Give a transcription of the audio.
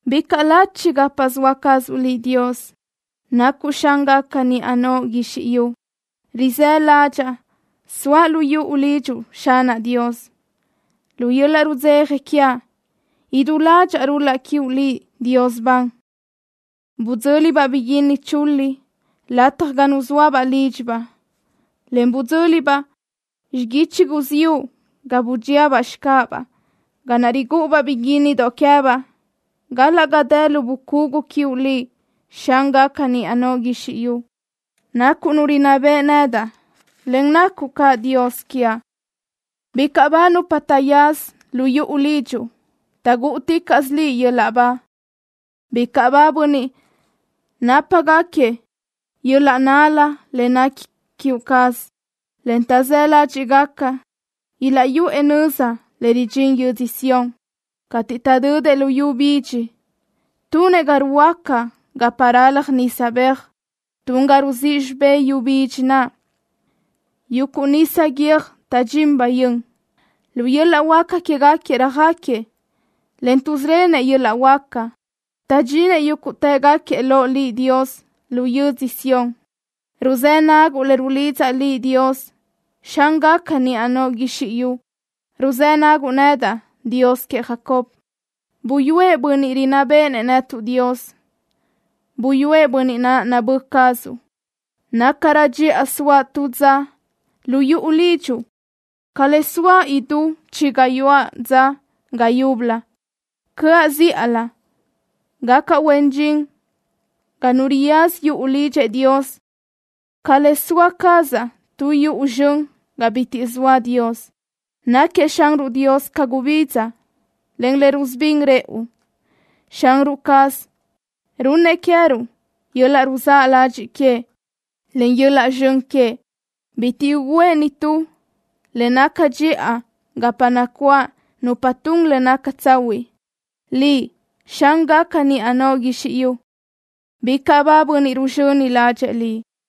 ¡Bicaʼ lachi gapa zoa cazuʼ Liʼ, Dios! ¡Nacuʼ Xángaca niʼa noʼo guizxi yu! Rizë́ ládxaʼa soaʼ lu yuʼu lidxuʼ, Xanaʼ Dios. Lu yöl-laʼ rudzeja quiaʼ idú ládxaʼa rul-laʼ quiuʼ Liʼ, Dios ban. Bidzö́libaʼ biguínni chulíʼ lataj ga nuzóabaʼ lídxibaʼ, en bidzö́libaʼ xiguichi guziúʼ ga budxíabaʼ xicáʼabaʼ, ga naʼ rigúʼubaʼ biguínnidoʼ queë́baʼ, galaʼ ga dë lu bucugu quiuʼ Liʼ, Xángaca niʼa noʼo guizxi yu. Nacuʼ Nu rinná beʼe nedaʼ, en nacuʼ caʼ Dios quiaʼ. ¡Bicaʼ ba nupa taʼyaza lu yuʼu lidxuʼ! ¡Taʼgúʼuticaʼsö Liʼ yöl-laʼ ba! ¡Bicaʼ ba bönniʼ nápagaquiëʼ yöl-laʼ nál-la le nequi queë cazuʼ, en taʼzë́ ládxiʼgaquiëʼ ilaʼyuʼë nöza le ridxín yödzö Sión! Cateʼ taʼdödëʼ lu yu bidxi tunëʼ ga ruhuöáca gapa ralaj nisa beaj. Tun ga rizíʼ xibé yu bidxi naʼ yuguʼ nisa guiö́j taʼdxín bayö́n. Lu yöl-laʼ huáca quégaquiëʼ röjáquiëʼ, en tuʼzíʼrönëʼ yöl-laʼ huáca. Taʼdxinëʼ yúguʼtëgaquiëʼ loʼ Liʼ, Dios, lu yödzö Sión. Ruzë́ naguʼ le rulidzaʼ Liʼ, Dios, Xángaca niʼa noʼo guizxi yu. Ruzë́ naguʼ nedaʼ, Dios queëʼ Jacob. Buyúëʼ bönniʼ rinná béʼenëʼ netuʼ, Dios. Buyúëʼ bönniʼ naʼ nabö́ cazuʼ. Nácarö dxiʼa soaʼ tu dza lu yuʼu lidxuʼ ca le soaʼ idú chi gayuáʼ dza ga yúbölö. Cö́aʼ zíʼalö gacaʼ huen dxin ga nu riyaza yuʼu lidxëʼ Dios ca le soa cazaʼ tu yuʼu zxön ga bitiʼ zoa Dios. Náquiëʼ Xanruʼ Dios ca gubidza, en le rusubín rëʼu. Xanruʼ caz runnëʼ queë́ruʼ yöl-laʼ ruzáʼ ladxiʼ queëʼ, en yöl-laʼ zxön queëʼ. Bitiʼ ugǘëʼ nitú le naca dxiʼa gapa nacuáʼ nupa tun le naca tsahuiʼ. ¡Liʼ, Xángaca niʼa noʼo guizxi yu, bicaʼ ba bönniʼ ruzxöni ládxëʼë Liʼ!